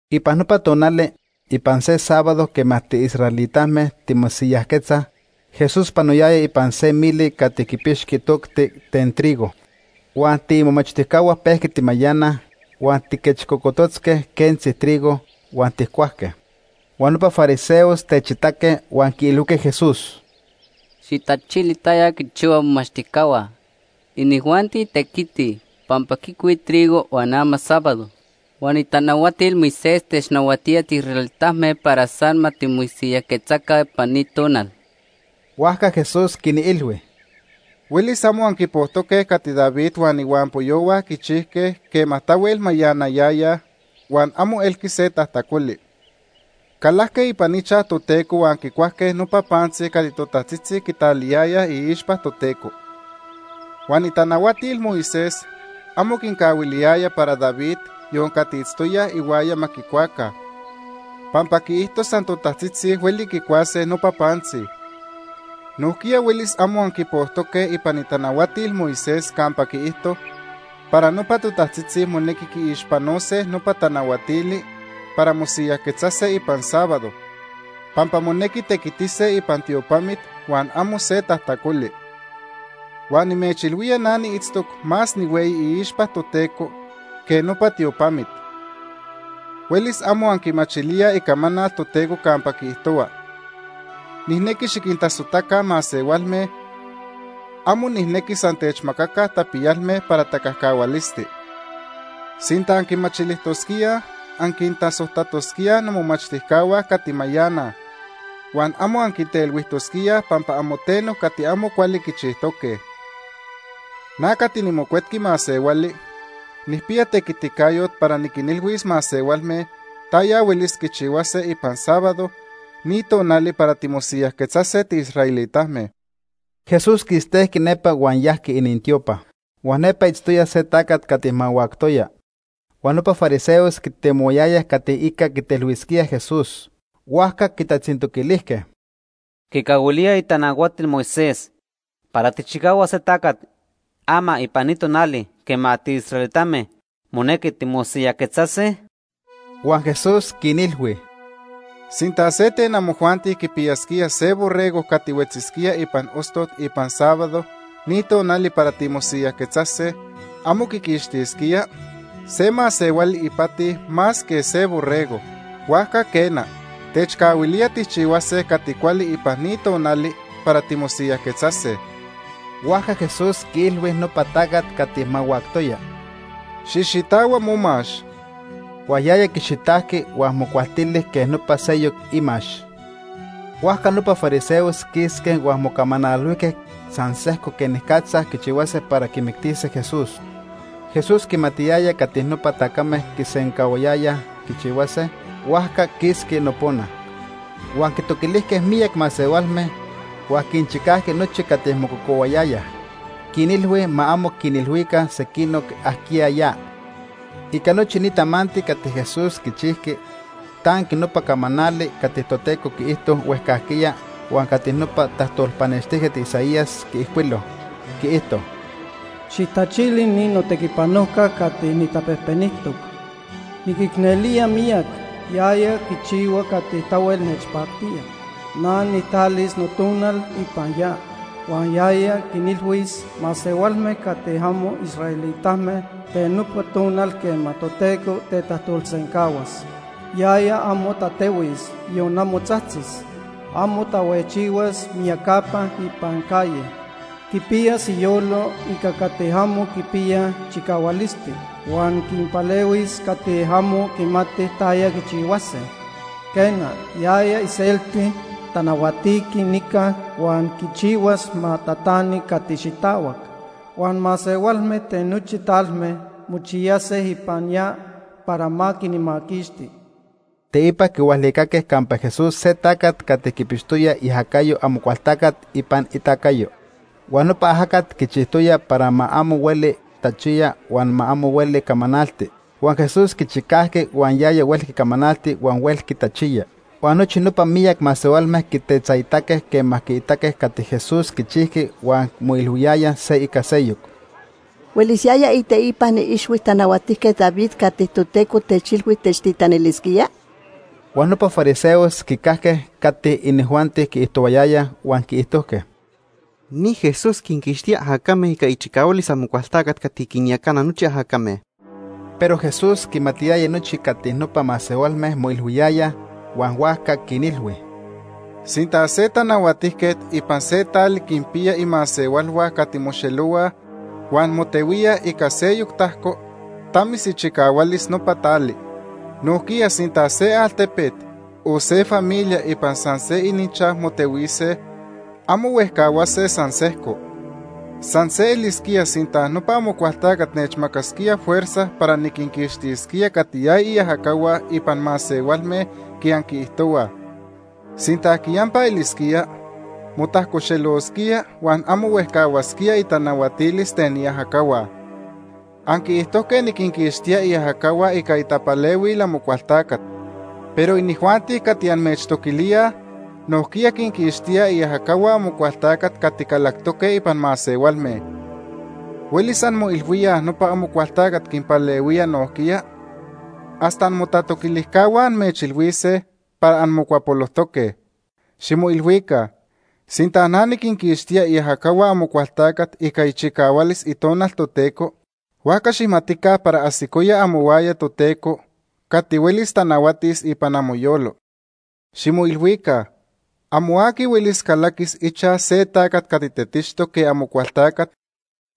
Ipan nopa tonali, ipan se sábado quema tiisraelitame timosiyajquetzaj, Jesús panoyaya ipan se mili cati quipixqui tocti ten trigo. Huan tiimomachtijcahua pejqui timayanaj huan tijquechcocototzque quentzi trigo huan tijcuajque. Huan nopa fariseos techitaque huan quiilhuijque Jesús: ―Xijtachili taya quichihuaj momomachtijcahua. Inijuanti tequitij, pampa quicuij trigo huan ama sábado. Huan itanahuatil Moisés technahuatía tiisraelitame para san ma timosiyajquetzaca ipan ni tonal. Huajca Jesús quinilhui: ―Huelis amo anquipojtoque cati David huan ihuampoyohua quichijque quema tahuel mayanayayaj huan amo elqui se tajtacoli. Calajque ipan ichaj Toteco huan quicuajque nopa pantzi cati totajtzitzi quitaliyayaj iixpa Toteco. Huan itanahuatil Moisés amo quincahuiliyaya para David, yon cati itztoyaj ihuaya ma quicuaca, pampa quiijto san totajtzitzi huelis quicuase nopa pantzi. Nojquiya huelis amo anquipojtoque ipan itanahuatil Moisés campa quiijto para nopa totajtzitzi monequi quiixpanose nopa tanahuatili para mosiyajquetzase ipan sábado, pampa monequi tequitise ipan tiopamit huan amo se tajtacoli. Huan nimechilhuía na niitztoc más nihueyi iixpa Toteco que nopa tiopamit. Huelis amo anquimachilíaj Icamanal Toteco campa quiijtohua: ‘Nijnequi xiquintasojtaca masehualme, amo nijnequi san techmacaca tapiyalme para tacajcahualisti.’ Sinta anquimachilijtosquíaj, anquintasojtatosquíaj nomomachtijcahua cati mayanaj, huan amo anquintelhuijtosquíaj pampa amo teno cati amo cuali quichijtoque. Na cati niMocuetqui Masehuali nijpiya tequiticayot para niquinilhuis masehualme taya huelis quichihuase ipan sábado, ni tonali para timosiyajquetzase tiisraelitame. Jesús quistejqui nepa huan yajqui inintiopa. Huan nepa itztoya se tacat cati mahuactoya. Huan nopa fariseos quitemohuayayaj cati ica quitelhuisquíaj Jesús, huajca quitatzintoquilijque: ―¿Quicahuilía itanahuatil Moisés para tijchicahuas se tacat ama ipan ni tonali quema tiisraelitame monequi timosiyajquetzase? Huan Jesús quinilhui: ―Sinta se ten amojuanti quipiyasquía se borrego cati huetzisquía ipan ostot ipan sábado ni tonali para timosiyajquetzase, ¿amo quiquixtisquía? Se masehuali ipati más que se borrego. Huajca quena, quicahuilía tijchihuase cati cuali ipan ni tonali para timosiyajquetzase. Huajca Jesús quiilhui nopa tacat cati mahuactoya: ―Xijxitahua momax. Huan yaya quixitajqui huan mocualtili quej nopa seyoc imax. Huajca nopa fariseos quisque huan mocamanalhuijque san sejco quenicatza quichihuase para quimictise Jesús. Jesús quimatiyaya cati nopa tacame quisencahuayayaj quichihuase, huajca quisqui nopona. Huan quitoquilijque miyac masehualme, huan quinchicajqui nochi cati mococohuayayaj. Quinilhui ma amo quinilhuica sequinoc ajquiya ya. Ica nochi ni tamanti cati Jesús quichijqui, tanqui nopa camanali cati Toteco quiijto huejcajquiya huan cati nopa tajtolpanextijquet Isaías quiijcuilo. Quiijto: “Xijtachili ni notequipanojca cati nijtapejpenijtoc. Niquicnelía miyac, yaya quichihua cati tahuel nechpactía. Na nijtalis Notonal ipan ya, huan yaya quinilhuis masehualme cati amo israelitame ten nopa tonal quema Toteco tetajtolsencahuas. Yaya amo tatehuis, yon amo tzajtzis. Amo tahuejchihuas miyacapa ipan calle. Quipiyas iyolo ica cati amo quipiyaj chicahualisti, huan quinpalehuis cati amo quimatij taya quichihuase. Quena, yaya iselti tanahuatiqui nica huan quichihuas ma tatani cati xitahuac. Huan masehualme ten nochi talme mochiyase ipan ya Ipan itoca. para ma quinmaquixti.” Teipa quihualicaque campa Jesús se tacat cati quipixtoya iajacayo Amocualtacat ipan itacayo. Huan nopa ajacat quichijtoya para ma amo hueli tachiya huan ma amo hueli camanalti. Huan Jesús quichicajqui huan yaya huelqui camanalti huan huelqui tachiya. Huan nochi nopa miyac masehualme quitetzaitaque quema quiitaque cati Jesús quichijqui huan moilhuiyayaj se ica seyoc: “¿Huelis yaya iteipan ixhui Tanahuatijquet David cati Toteco techilhui techtitanilisquía?” Huan nopa fariseos quicajque cati inijuanti quiijtohuayayaj huan quiijtojque: “Ni Jesús quinquixtía ajacame ica ichicahualis Amocualtacat cati quinyacana nochi ajacame.” Pero Jesús quimatiyaya nochi cati nopa masehualme moilhuiyayaj, huan huajca quinilhui: “Sinta se tanahuatijquet ipan se tali quinpiya imasehualhua cati moxelohuaj huan motehuíaj ica seyoc tajco, tamis ichicahualis nopa tali. Nojquiya sinta se altepet, o se familia ipan san se ininchaj motehuise, amo huejcahuase san sejco. San se elisquía sinta nopa Amocualtacat nechmacasquía fuerza para niquinquixtisquía cati yaya iajacahua ipan masehualme quej anquiijtohuaj. Sinta quiyampa elisquía, motajcoxelosquía huan amo huejcahuasquía itanahuatilis ten iajacahua. Anquiijtojque niquinquixtía iajacahua ica itapalehuil Amocualtacat Nopa masehualme quitocaxtijque Amocualtacat, Beelzebú., pero inijuanti cati amechtoquilíaj nojquiya quinquixtíaj iajacahua Amocualtacat cati calactoque ipan masehualme. ¿Huelis anmoilhuíaj nopa Amocualtacat quinpalehuía nojquiya? Hasta amotatoquilijcahua amechilhuise para anmocuapolojtoque. Ximoilhuica. Sinta na niquinquixtía iajacahua Amocualtacat ica ichicahualis Itonal Toteco, huajca xijmatica para ajsicoya amohuaya Toteco cati huelis tanahuatis ipan amoyolo. “Ximoilhuica, amo aqui huelis calaquis ichaj se tacat cati tetixtoc quej Amocualtacat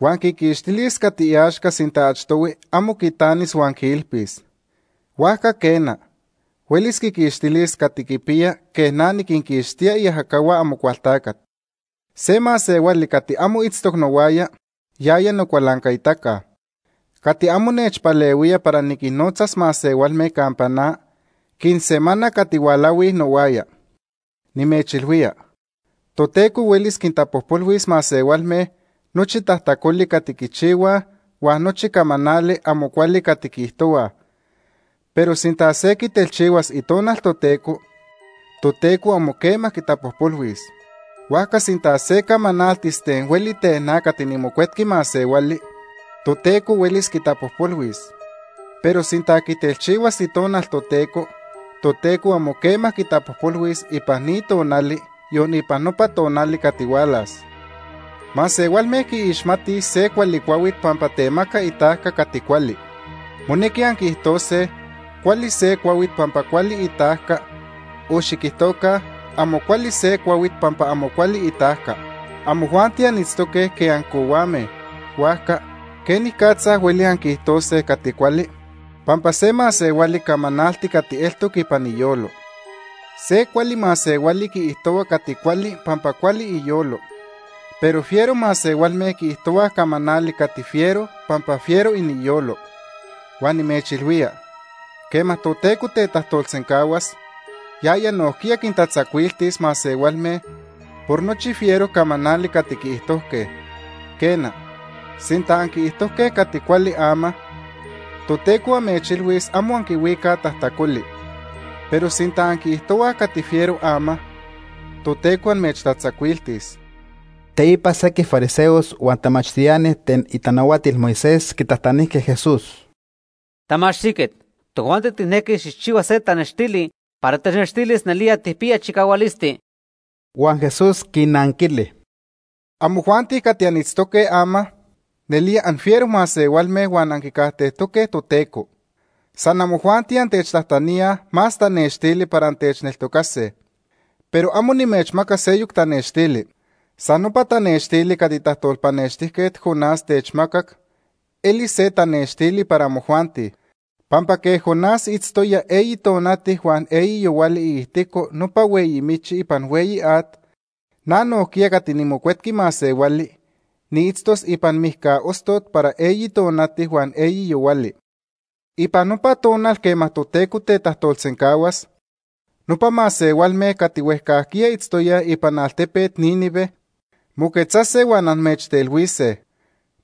huan quiquixtilis cati iaxca sinta achtohui amo quitanis huan quiilpis. Huajca quena, huelis quiquixtilis cati quipiya quej na niquinquixtía iajacahua Amocualtacat. “Se masehuali cati amo itztoc nohuaya, yaya nocualancaitaca. Cati amo nechpalehuía para niquinnotzas masehualme campa na, quinsemana cati hualahui nohuaya. “Nimechilhuía, Toteco huelis quintapojpolhuis masehualme nochi tajtacoli cati quichihuaj huan nochi camanali amo cuali cati quiijtohuaj, pero sinta se quitelchihuas Itonal Toteco, Toteco amo quema quitapojpolhuis. Huajca sinta se camanaltis ten hueli ten na cati niMocuetqui Masehuali, Toteco huelis quitapojpolhuis, pero sinta quitelchihuas Itonal Toteco, Toteco amo quitapojpolhuis ipan ni tonali, yon ipan nopa tonali cati hualas. “Masehualme quiixmatij se cuali cuahuit pampa temaca itajca cati cuali. Monequi anquiijtose cuali se cuahuit pampa cuali itajca o xiquijtoca amo cuali se cuahuit pampa amo cuali itajca. Amojuanti anitztoque quej ancohuame, huajca ¿quenicatza hueli anquiijtose cati cuali? Pampa se masehuali camanalti cati eltoc ipan iyolo. Se cuali masehuali quiijtohua cati cuali pampa cuali iyolo, pero fiero masehualme quiijtohuaj camanali cati fiero pampa fiero iniyolo. Huan nimechilhuía, quema Toteco tetajtolsencahuas, yaya nojquiya quintatzacuiltis masehualme por nochi fiero camanali cati quiijtojque. Quena, sinta anquiijtojque cati cuali ama, Toteco amechilhuis amo anquihuicaj tajtacoli. Pero sinta anquiijtohuaj cati fiero ama, Toteco amechtatzacuiltis.” Teipa sequij fariseos huan tamachtiani ten itanahuatil Moisés quitajtanijque Jesús: ―Tamachtijquet, tojuanti tijnequij xijchihua se tanextili para technextilis nelía tijpiya chicahualisti. Huan Jesús quinnanquili: ―Amojuanti cati anitztoque ama, nelía anfiero masehualme huan anquicajtejtoque Toteco. San amojuanti antechtajtaníaj más tanextili para antechneltocase. Pero amo nimechmacas seyoc tanextili. San nopa tanextili cati tajtolpanextijquet Jonás techmacac elis se tanextili para amojuanti. Pampa quej Jonás itztoya eyi tonati huan eyi yohuali iijtico nopa hueyi michi ipan hueyi at, na nojquiya cati niMocuetqui Masehuali, niitztos ipan mijca ostot para eyi tonati huan eyi yohuali. Ipan nopa tonal quema Toteco tetajtolsencahuas, nopa masehualme cati huejcajquiya itztoyaj ipan altepet Nínive moquetzase huan amechtelhuise.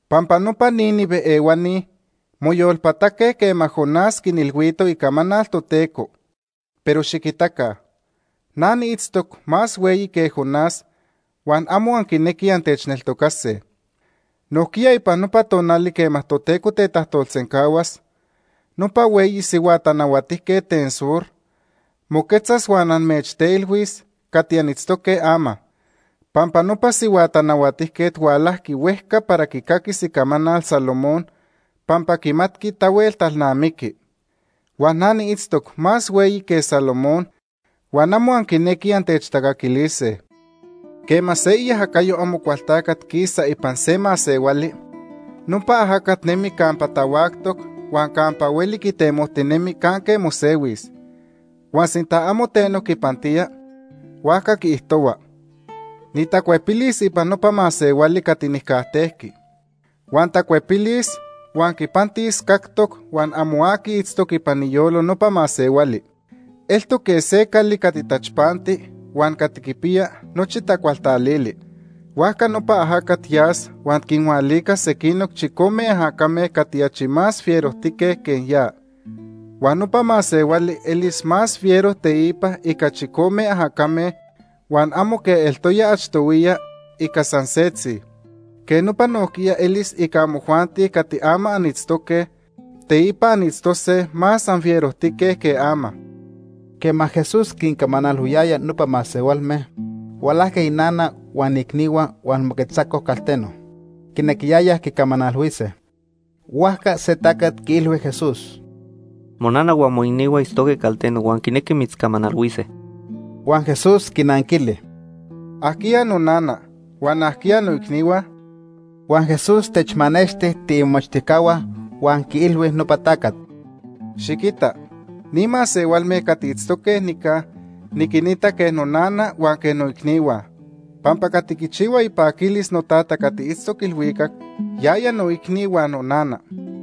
Pampa nopa Nínive ehuani moyolpataque quema Jonás quinilhuito icamanal Toteco, pero xiquitaca, na niitztoc más hueyi que Jonás huan amo anquinequij antechneltocase. Nojquiya ipan nopa tonali quema Toteco tetajtolsencahuas, nopa hueyi sihua tanahuatijquet ten sur moquetzas huan amechtelhuis cati anitztoque ama. Pampa nopa sihua tanahuatijquet hualajqui huejca para quicaquis icamanal Salomón pampa quimatqui tahuel talnamiqui. Huan na niitztoc más hueyi que Salomón, huan amo anquinequij antechtacaquilise. “Quema se iajacayo Amocualtacat quisa ipan se masehuali, nopa ajacat nemi campa tahuactoc huan campa hueli quitemojtinemi canque mosehuis, huan sinta amo teno quipantía, huajca quiijtohua: ‘Nitacuepilis ipan nopa masehuali cati nijcajtejqui.’ Huan tacuepilis huan quipantis cactoc huan amo aqui itztoc ipan iyolo nopa masehuali. Eltoc quej se cali cati tachpanti huan cati quipiya nochi tacualtalili. Huajca nopa ajacat yas huan quinhualicas sequinoc chicome ajacame cati achi más fierojtique que ya. Huan nopa masehuali elis más fiero teipa ica chicome ajacame huan amo quej eltoya achtohuiya ica san setzi. Quej nopa nojquiya elis ica amojuanti cati ama anitztoque, teipa anitztose más anfierojtique que ama.” Quema Jesús quincamanalhuiyaya nopa masehualme, hualajqui inana huan iicnihua huan moquetzacoj calteno. Quinequiyayaj quicamanalhuise. Huajca se tacat quiilhui Jesús: ―Monana huan moicnihua itztoque calteno huan quinequij mitzcamanalhuise. Huan Jesús quinanquili: ―¿Ajquiya nonana?, huan ¿ajquiya noicnihua? Huan Jesús techmanexti tiimomachtijcahua huan quiilhui nopa tacat: ―Xiquita, ni masehualme cati itztoque nica niquinita quej nonana huan quej noicnihua. Pampa cati quichihua ipaquilis noTata cati itztoc ilhuicac, yaya noicni huan nonana.